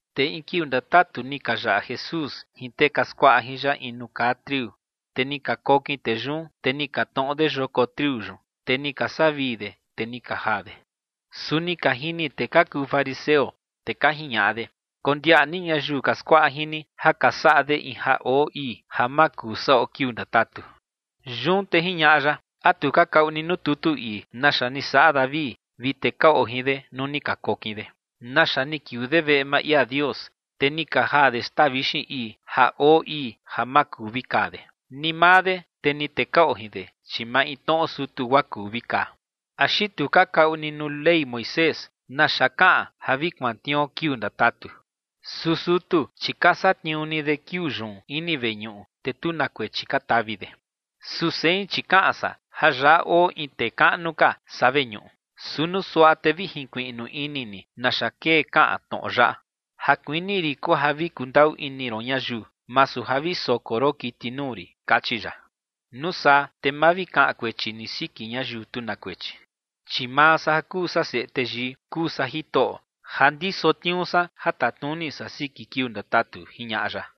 Te in kiuu ndatatu ni ka yaꞌa Jesús jin tee ka skuaꞌa jin ya in nuu kaa triu. Te ni ka kokin tee yun, te ni ka tnoꞌo de yoko triu yun, te ni ka saꞌa vii de, te ni ka jaa de. Su ni ka jini tee ka kuu fariseo, te ka jiñaꞌa de: ͏―͏Kondiaꞌa ni ñayiu ka skuaꞌa jin ni ja ka saꞌa de in ja oo ii ja ma kuu saꞌo kiuu ndatatu. Yun te jiñaꞌa ya: ͏―͏¿A tu ka kaꞌu ni nuu tutu ii naxa ni saꞌa David vi tee ka oo jin de nuu ni ka kokin de, naxa ni kiuu de veꞌe maa ia Dios, te ni ka jaa de xtaa vixin ii, ja oo ii ja ma kuu vi kaa de, ni maa de, te ni tee ka oo jin de, chi maintnoꞌo sutu guaa kuu vi kaa? ¿Axi tu ka kaꞌu ni nuu Ley Moisés naxa kaꞌan ja vi kuantniuo kiuu ndatatu? Su sutu, chi ka satniuu ni de kiuu yun ini veñuꞌu, te tu na kuechi ka tavi de. Su sein, chi kaꞌan san ja yaꞌa oo in tee kaꞌnu ka saa veñuꞌu. Su nuu suaꞌa te vi jinkuiꞌnu ini ni naxa kee kaꞌan tnoꞌo yaꞌa: “Ja kuini rin kuu ja vi kundaꞌu ini ron ñayiu, masu ja vi soko ron kiti nuu rin”, kachi ya. Nuu saa te ma vi kaꞌan kuechi ni siki ñayiu tu na kuechi. Chi maa san ja kuu Seꞌe Teyii kuu san Jitoꞌo ja ndiso tniuu san ja tatnuni san siki kiuu ndatatu ͏―͏jiñaꞌa ya.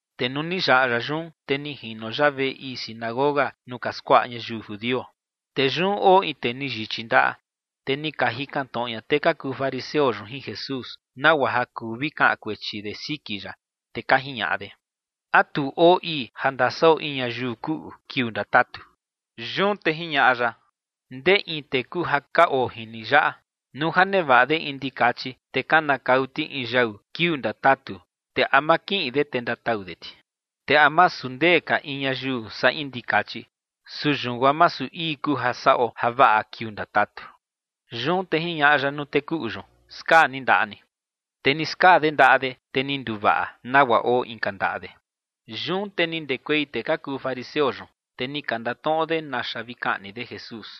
Te nuu ni yaꞌa ya yun, te ni jino ya veꞌe ii sinagoga nuu ka skuaꞌa ñayiu judio. Te yun oo in tee ni yichi ndaꞌa. Te ni ka jikan tnoꞌo ña tee ka kuu fariseo yun jin Jesús, nagua ja kuu vi kaꞌan kuechi de siki ya, te ka jiñaꞌa de: ͏―͏¿A tu oo ii ja ndasaꞌo in ñayiu kuꞌu kiuu ndatatu? Yun te jiñaꞌa ya: ͏―͏Ndee in tee kuu ja ka oo jin ni yaꞌa, nuu ja nevaꞌa de in ndikachi, te kanakau ti in yau kiuu ndatatu, te ¿a ma kiꞌin de te ndatau de ti? ¿Te a masu ndee ka in ñayiu saa in ndikachi? Su yun guaa masu ii kuu ja saꞌo javaꞌa kiuu ndatatu. Yun te jiñaꞌa ya nuu tee kuꞌu yun: ͏―͏Skaa ni ndaꞌa ni. Te ni skaa de ndaꞌa de, te ni nduvaꞌa nagua oo inka ndaꞌa de. Yun te ni ndekuei tee ka kuu fariseo yun, te ni ka ndatnoꞌo de naxa vi kaꞌni de Jesús.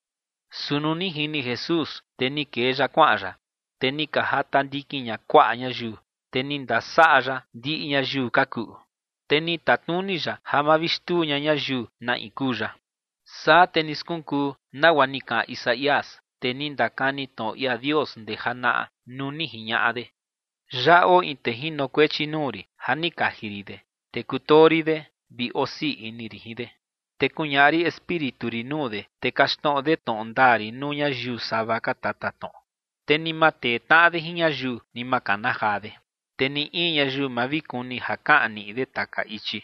Su nuu ni jini Jesús, te ni kee ya kuaꞌan ya. Te ni ka jata ndikin ña kuaꞌa ñayiu, te ni ndasaꞌa ya ndiꞌi ñayiu ka kuꞌu. Te ni tatnuni ya ja ma vi xtuu ña ñayiu na in kuu ya. Saa te ni skunkuu nagua ni kaꞌan Isaías, tee ni ndakani tnoꞌo ia Dios ndee janaꞌa nuu ni jiñaꞌa de: Yaꞌa oo in tee jinokuechi nuu rin ja ni kaji rin de. Te kutoo rin de vi osii ini rin jin de, te kuñaꞌa rin Espíritu rin nuu de, te kaxtnoꞌo de tnoꞌo ndaa rin nuu ñayiu sava ka tatatnoꞌo. Te ni ma tee tnaꞌa de jin ñayiu, ni ma kana jaa de, te ni in ñayiu ma vi kuni ja kaꞌan niꞌi de taka ichi.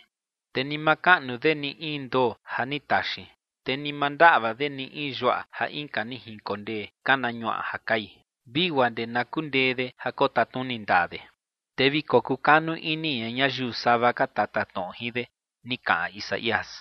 Te ni ma kaꞌnu de in ndoo ja ni taxin, te ni ma ndaꞌva de ni in yuaꞌa ja inka ni jinkondee kana ñuaꞌa ja kai, vi guaa ndee na kundee de ja kotatnuni ndaa de. Te vi kokukanu ini ña ñayiu sava ka tatatnoꞌo jin de, ni kaꞌan Isaías.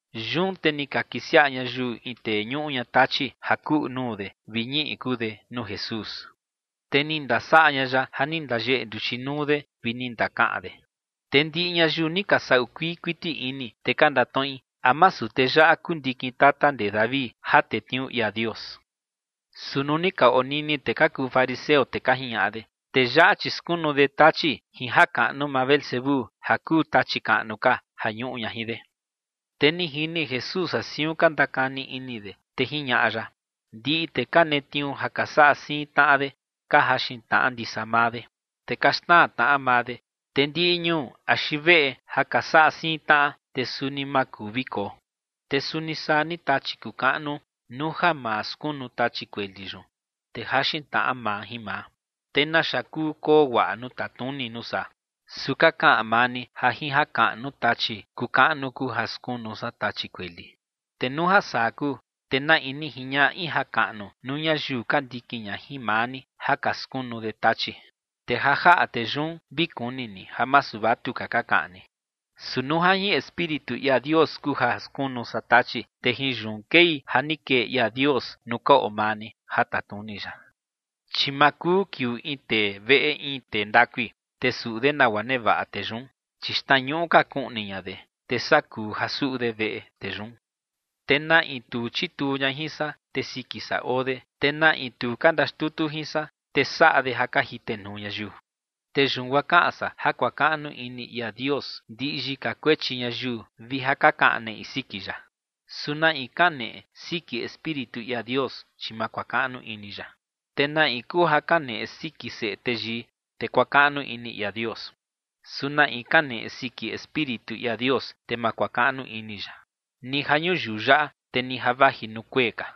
Yun te ni ka kisiaꞌa ñayiu in tee ñuꞌu ña tachi ja kuꞌu nuu de vi ñiꞌi kuu de nuu Jesús. Te ni ndasaꞌa ña ya ja ni ndayeꞌe nduchi nuu de vi ni ndakaꞌan de. Te ndiꞌi ñayiu ni ka saꞌu kuii kuiti ini, te ka ndatnoꞌi: ͏―͏¿A masu tee yaꞌa kuu ndikin tata ndee David ja tetniuu ia Dios? Su nuu ni ka onini tee ka kuu fariseo, te ka jiñaꞌa de: ͏―͏Tee yaꞌa, chi skunu de tachi jin jakaꞌnu maa Beelzebú, ja kuu tachi kaꞌnu ka, ja ñuꞌu ña jin de. Te ni jini Jesús ja siun ka ndakani ini de, te jiñaꞌa ya: ͏―͏Ndiꞌi tee ka netniuu ja ka saꞌa siin tnaꞌa de ka jaxin tnaꞌa ndisa maa de, te ka xnaa tnaꞌa maa de. Te ndiꞌi ñuu axi veꞌe ja ka saꞌa siin tnaꞌa, te suni ma kuu vi koo. Te suni saa ni tachi kuu kaꞌnu, nuu ja maa skunu tachi kueli yun, te jaxin tnaꞌa maa jin maa, te ¿naxa kuu koo guaꞌa nuu tatnuni nuu saa? Su ka kaꞌan maa ni ja jin jakaꞌnu tachi kuu kaꞌnu kuu ja skunu san tachi kueli. Te nuu ja saa kuu, te ¿na in ni jiñaꞌa in jakaꞌnu nuu ñayiu ka ndikin ña jin maa ni ja ka skunu de tachi? Te ja jaꞌa tee yun vi kuni ni ja masu vatuka ka kaꞌan ni. Su nuu ja jin Espíritu ia Dios kuu ja skunu san tachi, te jin yun kei ja ni kee ia Dios nuu ka oo maa ni ja tatnuni ya. ’Chi ma kuu kiuu in tee veꞌe in tee ndakui, te suꞌu de nagua nevaꞌa tee yun. Chi xtnañuꞌu ka kuꞌni ña de, te saa kuu ja suꞌu de veꞌe tee yun. ’Te na in tu chituu ña jin san, te siki san oo de. Te na in tu ka ndaxtutu jin san, te saꞌa de ja ka jitenuu ñayiu. ’Te yun guaa kaꞌan san ja kuakaꞌnu ini ia Dios ndiꞌi yika kuechi ñayiu vi ja ka kaꞌan neꞌi siki ya. Su na in kaneꞌe siki Espíritu ia Dios, chi ma kuakaꞌnu ini ya. Te na in kuu ja kaneꞌe siki Seꞌe Teyii, te kuakaꞌnu ini ia Dios. Su na in kaneꞌe siki Espíritu ia Dios, te ma kuakaꞌnu ini ya, ni ja ñuyiu yaꞌa, te ni ja vaji nuu kuee ka.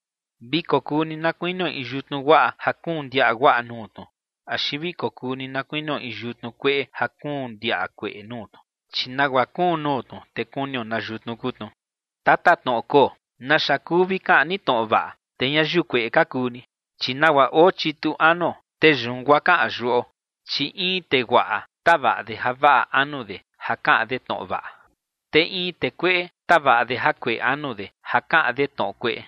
’Vi kokuu ni na kuinio in yutnu guaꞌa, ja kuun ndiaꞌa guaꞌa nuu tnu, axi vi kokuu ni na kuinio in yutnu kueꞌe ja kuun ndiaꞌa kueꞌe nuu tnu. Chi nagua kuun nuu tnu, te kunio na yutnu kuu tnu. ¡Tatatnoꞌo koo! ¿Naxa kuu vi kaꞌan ni tnoꞌo vaꞌa, te ñayiu kueꞌe ka kuu ni? Chi nagua oo chitu anuo, te yun guaa kaꞌan yuꞌo. Chi in tee guaꞌa tavaꞌa de javaꞌa anu de ja kaꞌan de tnoꞌo vaꞌa. Te in tee kueꞌe tavaꞌa de jakueꞌe anu de, ja kaꞌan de tnoꞌo kueꞌe.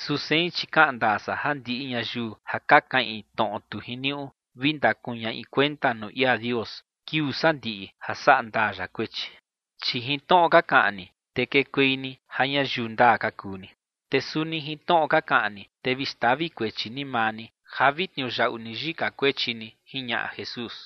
Su sein, chi kaꞌan ndaa san ja ndiꞌi ñayiu ja ka kaꞌin tnoꞌo tu jiniuꞌu, vi ndakuñaꞌi kuenta nuu ia Dios kiuu sandiꞌi ja saꞌa ndaa ya kuechi. Chi jin tnoꞌo ka kaꞌan ni, te kekuei ni ja ñayiu ndaa ka kuu ni. Te suni jin tnoꞌo ka kaꞌan ni, te vi xtavi kuechi ni maa ni ja vi tniuyaꞌu ni yika kuechi ni ͏―͏jiñaꞌa Jesús.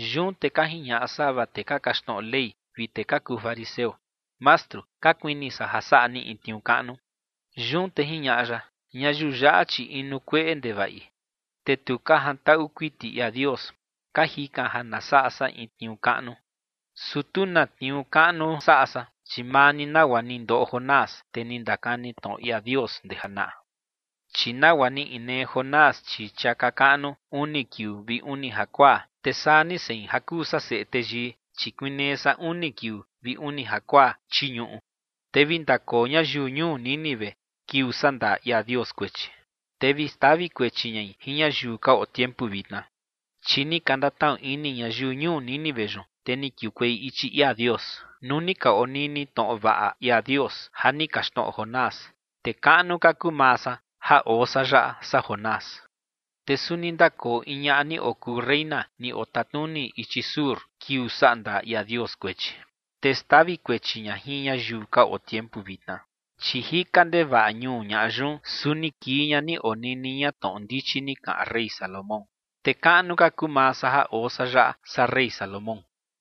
Yun te ka jiñaꞌa sava tee ka kaxtnoꞌo Ley vi tee ka kuu fariseo: ͏―͏Mastru, ka kuini san ja saꞌa ni in tniuu kaꞌnu. Yun te jiñaꞌa ya: ͏―͏Ñayiu yaꞌa, chi inu kueꞌe ndevaꞌi, te tu ka jantaꞌu kuiti ia Dios, ka jikan ja na saꞌa san in tniuu kaꞌnu. Su tu ka na tniuu kaꞌnu saꞌa san, chi maa ni nagua ni ndoꞌo Jonás, tee ni ndakani tnoꞌo ia Dios ndee janaꞌa. Chi nagua ni inee Jonás chii chiaka kaꞌnu uni kiuu vi uni jakuaa, te saa ni sein ja kuu san Seꞌe Teyii, chi kuinee san uni kiuu vi uni jakuaa chii ñuꞌu. Te vi ndakoo ñayiu ñuu Nínive kiuu sandaa ia Dios kuechi, te vi xtavi kuechi ñai jin ñayiu ka oo tiempu vitna, chi ni ka ndatnaꞌu ini ñayiu ñuu Nínive yun, te ni kiukuei ichi ia Dios, nuu ni ka onini tnoꞌo vaꞌa ia Dios ja ni kaxtnoꞌo Jonás. Te kaꞌnu ka kuu maa san ja oo san yaꞌa, saa Jonás. Te suni ndakoo in ñaꞌa ni okuu reyna ni otatnuni ichi sur, kiuu sandaa ia Dios kuechi, te xtavi kuechi ña jin ñayiu ka oo tiempu vitna, chi jika ndevaꞌa ñuu ñaꞌa yun, su ni kii ña ni onini ña tnoꞌo ndichi ni kaꞌan rey Salomón. Te kaꞌnu ka kuu maa san ja oo san yaꞌa, saa rey Salomón.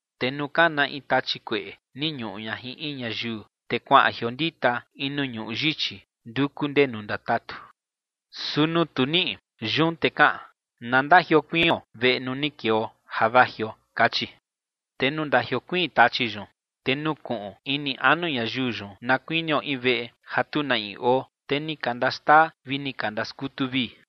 ’Te nuu kana in tachi kueꞌe ni ñuꞌu ña jin in ñayiu, te kuaꞌan jiondita in nuu ñuꞌu yichi nduku ndenu ndatatu. Su nuu tu niꞌi, yun te kaꞌan: “Na ndajiokuion veꞌe nuu ni keo ja vajio”, kachi. Te nuu ndajiokuiin tachi yun, te nukuꞌun ini anu ñayiu yun na kuinio in veꞌe ja tu na in oo, te ni ka ndaxtaa vi ni ka ndaskutu vii.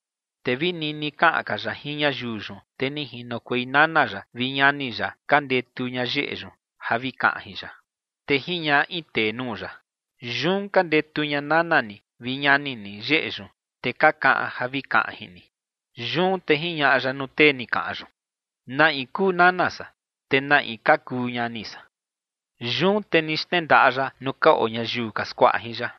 Te vi nini kaꞌan ka ya jin ñayiu yun, te ni jinokuei nana ya vi ñani ya ka ndetu ña yeꞌe yun ja vi kaꞌan jin ya. Te jiñaꞌa in tee nuu ya: ͏―͏Yun ka ndetu ña nana ni vi ñani ni yeꞌe yun, te ka kaꞌan ja vi kaꞌan jin ni. Yun te jiñaꞌa ya nuu tee ni kaꞌan yun: ͏―͏¿Na in kuu nana san, te na in ka kuu ñani san? Yun te ni xnendaꞌa ya nuu ka oo ñayiu ka skuaꞌa jin ya,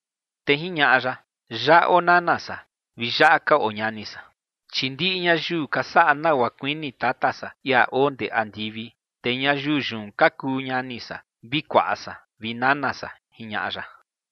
te jiñaꞌa ya: ͏―͏Yaꞌa oo nana san vi yaꞌa ka oo ñani san. Chi ndiꞌi ñayiu ka saꞌa nagua kuini Tata san, ia oo ndee andivi, te ñayiu yun ka kuu ñani san, vi kuaꞌa san vi nana san ͏―͏jiñaꞌa ya.